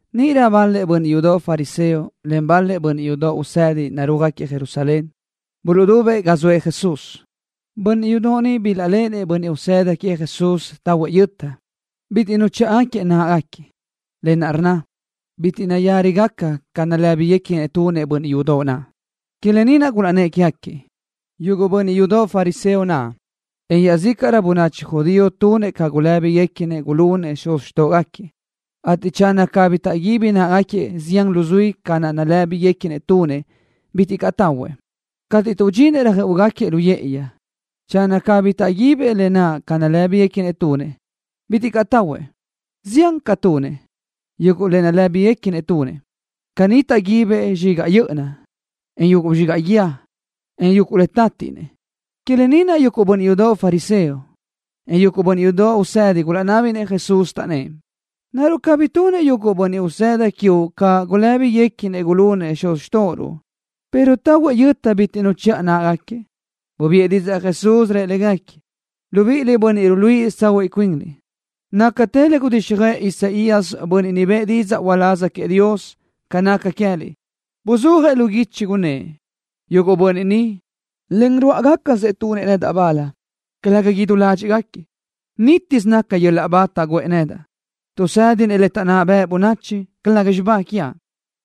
Níʼirö bal-lëʼ bönniʼ yudoʼ fariseo len bal-lëʼ bönniʼ yudoʼ usedi narúajgaquiëʼ Jerusalén, buluʼdubëʼ ga zoëʼ Jesús. Bönniʼ yudoʼ ni bilaʼléʼenëʼ bönniʼ usëda queëʼ Jesús tahuëʼ yöta, bitiʼ nuchíʼagaquiëʼ náʼagaquiëʼ, lë naʼ rnna: Bitiʼ nayárigaca ca nalë́biguequinëʼ tunëʼ bönniʼ yudoʼ naʼ. Que lë ni naʼ gulaʼnnë́ʼ quégaquiëʼ. Yuguʼ bönniʼ yudoʼ fariseo naʼ, en iaʼzícaʼrö bönachi judío tunëʼ ca gulë́biguequinëʼ gulunëʼ xuz xtóʼogaquiëʼ, ateʼ channö cabí taʼguíbi náʼagaquiëʼ zián luzuí ca naʼ nalë́biguequinëʼ tunëʼ, bitiʼ caʼ tahuëʼ. Cateʼ tuʼdxinëʼ röjö́ʼugaquiëʼ lu yë́ʼëyi, channö cabí taʼguibëʼ lë naʼ ca nalë́biguequinëʼ tunëʼ, bitiʼ caʼ tahuëʼ. Ziánrö caʼ tunëʼ, yuguʼ le nalë́biguequinëʼ tunëʼ. Caní taʼguibëʼ zxigaʼ yö́ʼöna, en yuguʼ zxigaʼ guíë, en yuguʼ le tátiʼnëʼ. Que lë ni naʼ yuguʼ bönniʼ yudoʼ fariseo, en yuguʼ bönniʼ yudoʼ usedi gulaʼnábinëʼ Jesús, taʼnnë́ʼ: —¿Naruʼ cabí tunëʼ yuguʼ bönniʼ usëda quiuʼ ca gulë́biguequinëʼ gulunëʼ xuz xtóʼoruʼ, pero tahuëʼ yöta bitiʼ nuchíʼagaquiëʼ náʼagaquiëʼ? Bubiʼë didzaʼ Jesús, rëʼ légaquiëʼ: —Libiʼiliʼ, bönniʼ ruluíʼisö tsahuiʼ cuinliʼ. Nácatë le gudíxjöʼë Isaías, bönniʼ niʼ bëʼë didzaʼ uláz queëʼ Dios, ca naca queë́liʼ. Buzúajëʼ lu guichi, gunnë́ʼ: Yuguʼ bönniʼ ni, len rúʼagacasëʼ tunëʼ nedaʼ bal, calëga idú ládxiʼgaquiëʼ. Nítiʼsö naca yöl-laʼ ba taʼguʼë nedaʼ tuʼ tuʼsë́dinëʼ le taʼnná bëʼ bönachi, calëga xibá quiaʼ.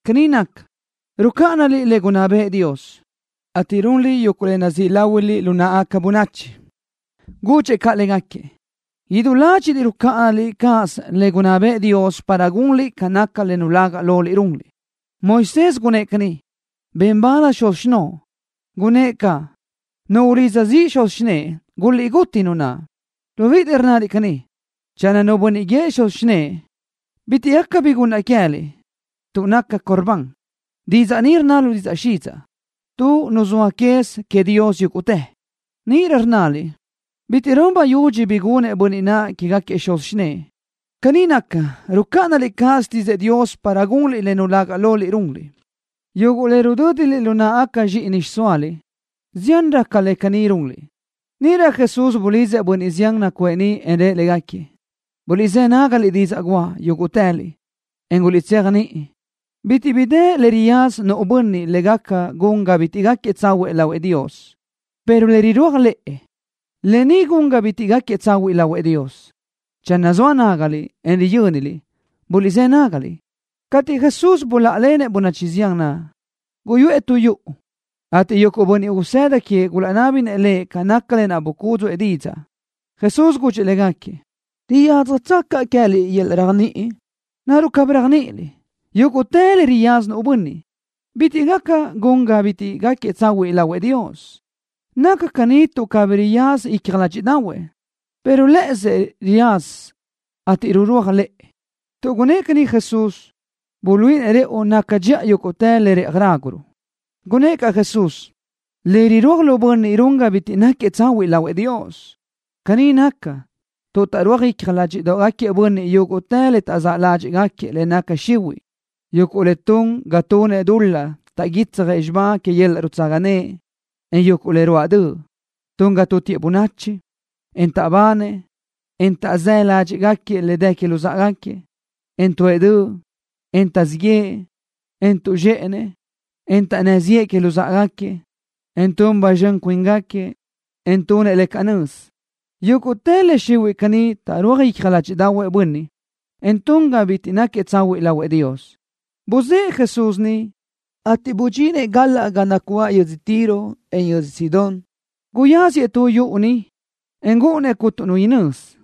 Caní naca, tuʼ rucáʼanaliʼ le gunná bëʼë Dios, ateʼ runliʼ yuguʼ le nazíʼ láhuiliʼ lu náʼagaca bönachi. Gudxëʼ caʼ légaquiëʼ: —Idú ládxiʼliʼ rucáʼanaliʼ cáʼasö le gunná bëʼë Dios para gunliʼ ca naca le nulaga loliʼ runliʼ. Moisés gunnë́ʼ caní: “Ben bal xuz xinóʼo.” Gunnë́ʼ caʼ: “Nu ulidza ziʼ xuzi o xinëʼe, guliʼgútitë nu naʼ.” Libíʼiliʼ rnnaliʼ caní: “Channö nu bönniʼ guíëʼ xuzëʼ o xinë́ʼë: Bitiʼ gaca bi gunnaʼ queë́liʼ, tuʼ naca Corbán.” (Didzaʼ ni rnna lu didzaʼ xidzaʼ: Tuʼ nuzóaʼ quez queëʼ Dios yúguʼtë.) Níʼirö rnnaliʼ: “Bitiʼ run bayudxi bi gunëʼ bönniʼ naʼ quégaquiëʼ xuz xinë́ʼë.” Caní naca, rucáʼanaliʼ cáʼasö xtídzëʼë Dios para gunliʼ le nulaga loliʼ runliʼ, yuguʼ le rudö́diliʼ lu náʼagaca zxíʼini xiʼsóaliʼ. Ziánrö caʼ le caní runliʼ. Níʼirö Jesús bulidzëʼ bönniʼ zián naʼ nacuʼë niʼ, en rëʼ légaquiëʼ: —Guliʼzë́ nágaliʼ didzaʼ guʼa, yúguʼtëliʼ, en guliʼtséajniʼi. Bitiʼ bi dë le riyaza nu bönniʼ le gaca gun ga bitiʼ náquiëʼ tsahuiʼ lahuëʼ Dios, pero le rirúaj lëʼ, lë ni gaca gun ga bitiʼ náquiëʼ tsahuiʼ lahuëʼ Dios. Channö zoa nágaliʼ, en riyö́niliʼ, buliʼzë́ nágaliʼ. Cateʼ Jesús buláʼalenëʼ bönachi zián naʼ, guyuʼë tu yuʼu, ateʼ yuguʼ bönniʼ usëda queëʼ gulaʼnábinëʼ Lëʼ ca naca lë naʼ bucúdzuʼë didzaʼ. Jesús gudxëʼ légaquiëʼ: —¿Riyádzjatsö caʼ queë́liʼ yöl-laʼ réajniʼi? ¿Naruʼ cabí réajniʼiliʼ, yúguʼtë le riyaza nu bönniʼ, bitiʼ gaca gun ga bitiʼ náquiëʼ tsahuiʼ lahuëʼ Dios? Naca caní tuʼ cabí riyaza icja ládxiʼdaʼahuëʼ, pero lë́ʼësëʼ riyaza, ateʼ rurúaj lëʼë. Tuʼ gunnë́ʼ caní Jesús, buluíʼinëʼ rëʼu naca dxiʼa yúguʼtë le rëʼaj ráguruʼ. Gunnë́ʼ caʼ Jesús: —Le rirúaj lu bönniʼ run ga bitiʼ náquiëʼ tsahuiʼ lahuëʼ Dios. Caní naca, tuʼ taʼrúaj icja ládxiʼdoʼgaquiëʼ bönniʼ yuguʼ le taʼzáʼ ládxiʼgaquiëʼ le naca xihuiʼ, yuguʼ le tun ga tunëʼ dul-laʼ taʼguitsjëʼ xibá que yöl-laʼ nutsaga naʼ, en yuguʼ le ruáʼ döʼ. Tun ga tútiëʼ bönachi, en taʼbanëʼ, en taʼzë́ ládxiʼgaquiëʼ le dë que luzáʼagaquiëʼ, en tuʼë döʼ, en taʼzíʼ yëʼë, en tuʼzxë́ʼë, en taʼnná ziʼë que luzáʼagaquiëʼ, en tun ba zxön cuíngaquiëʼ, en tunëʼ le canö́z. Yúguʼtë le xihuiʼ caní taʼrúaj icja ládxiʼdaʼahuëʼ nu bönniʼ, en tun ga bitiʼ náquiëʼ tsahuiʼ lahuëʼ Dios. Buzë́ʼë Jesús niʼ, ateʼ bidxinëʼ galaʼ ga nacuáʼ yödzö Tiro, en yödzö Sidón. Guyáziëʼ tu yuʼu niʼ, en gúʼunnëʼ cuntu nu inözi,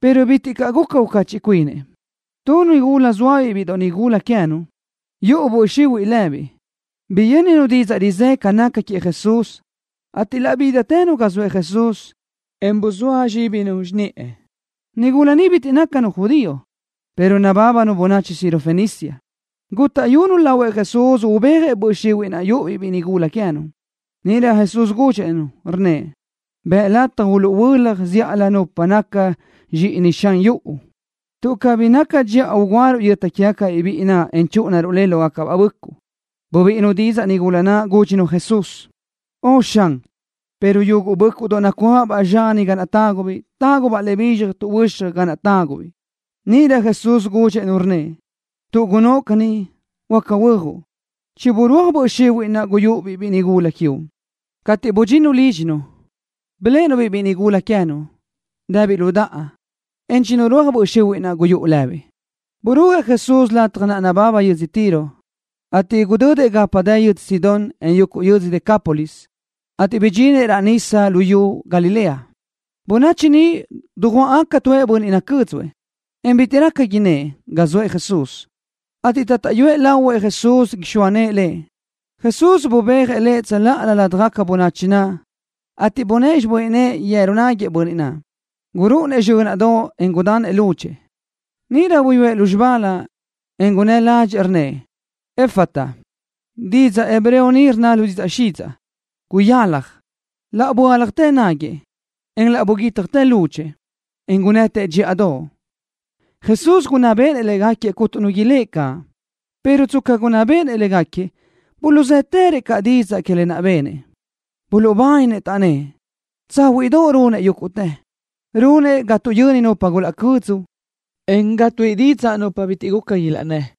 pero bitiʼ caʼ guca ucachiʼ cuinëʼ. Tu nigula zóabiʼ biʼi nigúladoʼ queë́nu, yuʼu böʼ xihuiʼ lëbiʼ, biyö́ninu didzaʼ rizë́ ca naca queëʼ Jesús, ateʼ laʼ bídatënu ga zoëʼ Jesús, en buzóa zxíbinu xiniʼë. Nigula ni bitiʼ nácanu judío, pero nabábanu bönachi Sirofenicia. Gútaʼyunu lahuëʼ Jesús ubéajëʼ böʼ xihuiʼ naʼ yuʼu-biʼ biʼi nigúladoʼ queë́nu. Níʼirö Jesús gudxëʼ-nu, rnnëʼ: —Bëʼ lataj uluʼhuölaj zíʼalö nupa nácagaca ca zxíʼini xan yuʼu, tuʼ cabí naca dxiʼa ugúaruʼ yöta quégacabiʼ biʼi naʼ, en chúʼunaruʼ le lógacabaʼ bö́ʼcuʼdoʼ. Bubíʼinu didzaʼ nigula naʼ, gúdxinu Jesús: —Ön, Xan, pero yuguʼ bö́ʼcuʼdoʼ nacuáʼabaʼ zxani ga tágubiʼ, tágubaʼ le bizxaj tuʼhuö́xaj ga naʼ tágubiʼ. Níʼirö Jesús gudxëʼ-nu, rnnëʼ: —Tuʼ gunnóʼ caní, huáca huö́ajuʼ. Chiburúaj böʼ xihuiʼ naʼ guyúʼu-biʼ biʼi nigúladoʼ quiuʼ. Cateʼ budxinnu lídxinu, biléʼenu-biʼ biʼi nigúladoʼ queë́nu naʼ, dëbiʼ lu daʼa, en chinurúaj böʼ xihuiʼ naʼ guyúʼu lëbiʼ. Burúajëʼ Jesús lataj naʼ nababa yödzö Tiro, ateʼ gudödëʼ gapa dë yödzö Sidón, en yuguʼ yödzö Decápolis, ateʼ bidxinëʼ raʼ nísadoʼ lu xiyú Galilea. Bönachi niʼ dujuáʼgaca tuëʼ bönniʼ nacö́dzuëʼ, en bitiʼ raca innë́ʼ ga zoëʼ Jesús, ateʼ taʼtaʼyu lahuëʼ Jesús ixóa nëʼë lëʼ. Jesús bubéajëʼ lëʼ tsöláʼalö ládjagaca bönachi naʼ, ateʼ bunë́ʼë xibö́n nëʼë yeru náguiëʼ bönniʼ naʼ. Gurúʼunëʼ zxö́naʼdoʼ, en gudanëʼ lúdxëʼë. Níʼirö buyúëʼ lúzxibálö, en gunnë́ ládxëʼë, rnnëʼ: —Efata. Didzaʼ hebreo ni rnna lu didzaʼ xidzaʼ: Guyalaj. Laʼ böáljatë náguiëʼ, en laʼ buguítjatë lúdxëʼë, en gunnëtëʼ dxíʼadoʼ. Jesús gunná béʼenëʼ légaquiëʼ cuntu nu ilë́ʼ caʼ, pero tsca gunná béʼenëʼ légaquiëʼ, buluʼzë́tërëʼ caʼ didzaʼ que lë naʼ benëʼ. Buluʼbáninë, taʼnnë́ʼ: —Tsáhuiʼdoʼ runëʼ yúguʼtë. Runëʼ ga tuʼyöni nupa gulaca cödzu, en ga tuíʼi didzaʼ nupa bitiʼ guca ilaʼnnë́.